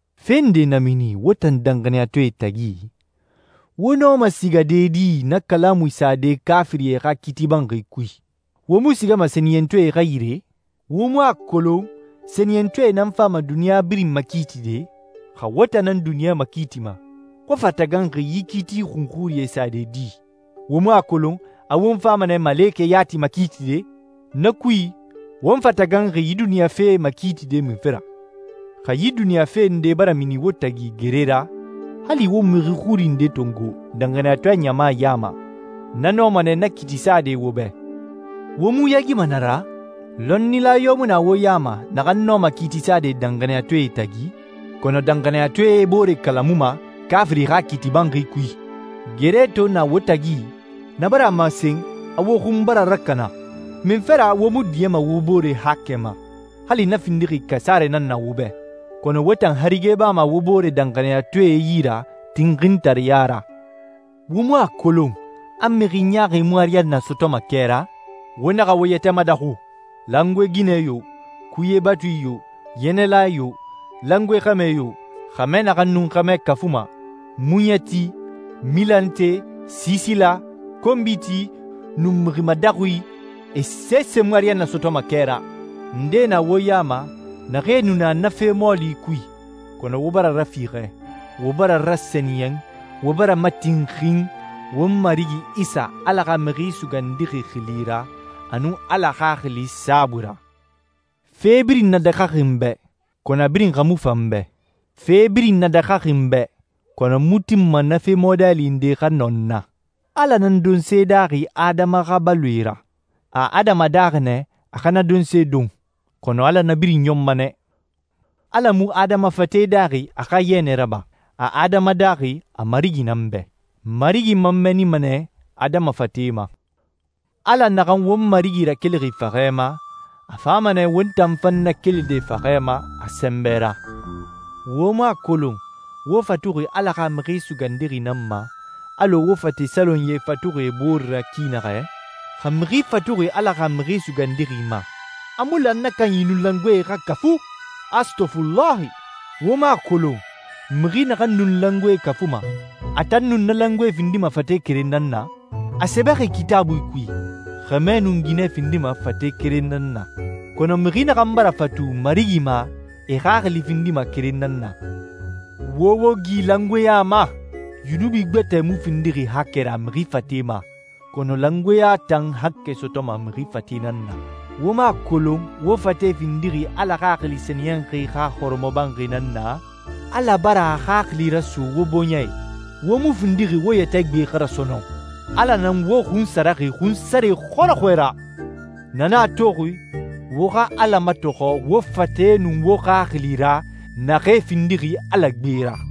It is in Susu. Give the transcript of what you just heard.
Fe nde na mini wo tan danxaniyatɔɛe tagi, wo nɔma sigade di na kalamui sade kaafirie xa kiiti banxi kui? Wo mu sigama sɛniyɛntɔɛe xa yire? Wo mu a kolon sɛniyɛntɔɛe nan fama duniɲa birin makiitide? Xa wo tan nan duniɲa makiitima, wo fa taganxi yi kiiti xunxurie sade di? Wo mu a kolon a won fama nɛ malekɛe yati makiitide? Na kui, won fa taganxi yi duniɲa fee makiitide munfe ra? Xa yi duniɲa fe nde bara mini wo tagi gere ra, hali wo mixi xuri nde tongo danxaniyatɔɛ ɲama ya ma, na nɔma nɛ na kiiti sade wo bɛ. Wo mu yaagima na ra? Lɔnnila yo mu na wo ya ma naxan nɔma kiiti sade danxaniyatɔɛe tagi? Kɔnɔ danxaniyatɔɛe e boore kalamuma kaafiri xa kiiti banxi kui. Gere to na wo tagi, na bara a masen a wo xun bara rakana. Munfe ra wo mu diɲɛma wo bore haakɛ ma, hali na findixi kasarɛ nan na wo bɛ? Kɔnɔ wo tan harige bama wo boore danxaniyatɔɛe yi ra tinxintareya ra. Wo mu a kolon a mixi ɲaaxi mu ariyanna sɔtɔma kɛ ra? Wo naxa wo yɛtɛ madaxu. Langoe ginɛ yo, kuye batui yo, yɛnɛla yo, langoe xɛmɛ yo, xɛmɛ naxan nun xɛmɛ kafuma, muɲɛti, milante, siisila, konbiti, nun mixi madaxui, e sese mu ariyanna sɔtɔma kɛ ra. Ndee na wo ya ma naxee nu na na fe mɔɔli kui, kɔnɔ wo bara rafiixɛ, wo bara rasɛniyɛn, wo bara matinxin, won Marigi Isa, Ala xa Mixi Sugandixi xili ra, a nun Ala Xaxili saabui ra. Fe birin nadaxaxi n bɛ, kɔnɔ a birin xa mu fan n bɛ. Fe birin nadaxaxi n bɛ, kɔnɔ n mu tinma na fe mɔɔli nde xa nɔ n na. Ala nan donse daaxi adama xa baloe ra, a adama daaxi nɛ a xa na donse don, kɔnɔ Ala na birin ɲɔnma nɛ. Ala mu adama fate daaxi a xa yɛnɛ raba. A adama daaxi a Marigi nan bɛ. Marigi man mɛɛnima nɛ adama fate ma. Ala naxan won Marigi rakelixi faxɛ ma, a fama nɛ won tan fan nakelide faxɛ ma a sɛnbɛ ra. Wo mu a kolon wo fatuxi Ala xa Mixi Sugandixi nan ma, alɔ wo fate salonyie fatuxi e bore ra ki naxɛ? Xa mixi fatuxi Ala xa Mixi Sugandixi ma, a mu lan na kanyi nun langoe xa kafu. Astɔfulahi! Wo mu a kolon mixi naxan nun langoe kafuma, a tan nun na langoe findima fate keren nan na? A sɛbɛxi Kitaabui kui, «Xɛmɛ nun ginɛ findima fate keren nan na.» Kɔnɔ mixi naxan bara fatu Marigi ma, e xaxili findima keren nan na. Wo wo gi langoeɲa ma. Yunubi gbɛtɛ mu findixi haakɛ ra mixi fate ma, kɔnɔ langoeɲa tan haakɛ sɔtɔma mixi fate nan na. Wo mu a kolon wo fate findixi Ala Xaxili Sɛniyɛnxi xa hɔrɔmɔbanxi nan na? Ala bara a Xaxili raso wo bɔɲɛ i. Wo mu findixi wo yɛtɛ gbe xa ra sɔnɔn. Ala nan wo xunsaraxi xunsare xɔrɔxɔɛ ra. Na nan a toxi wo xa Ala matɔxɔ wo fate nun wo xaxili ra, naxee findixi Ala gbe ra.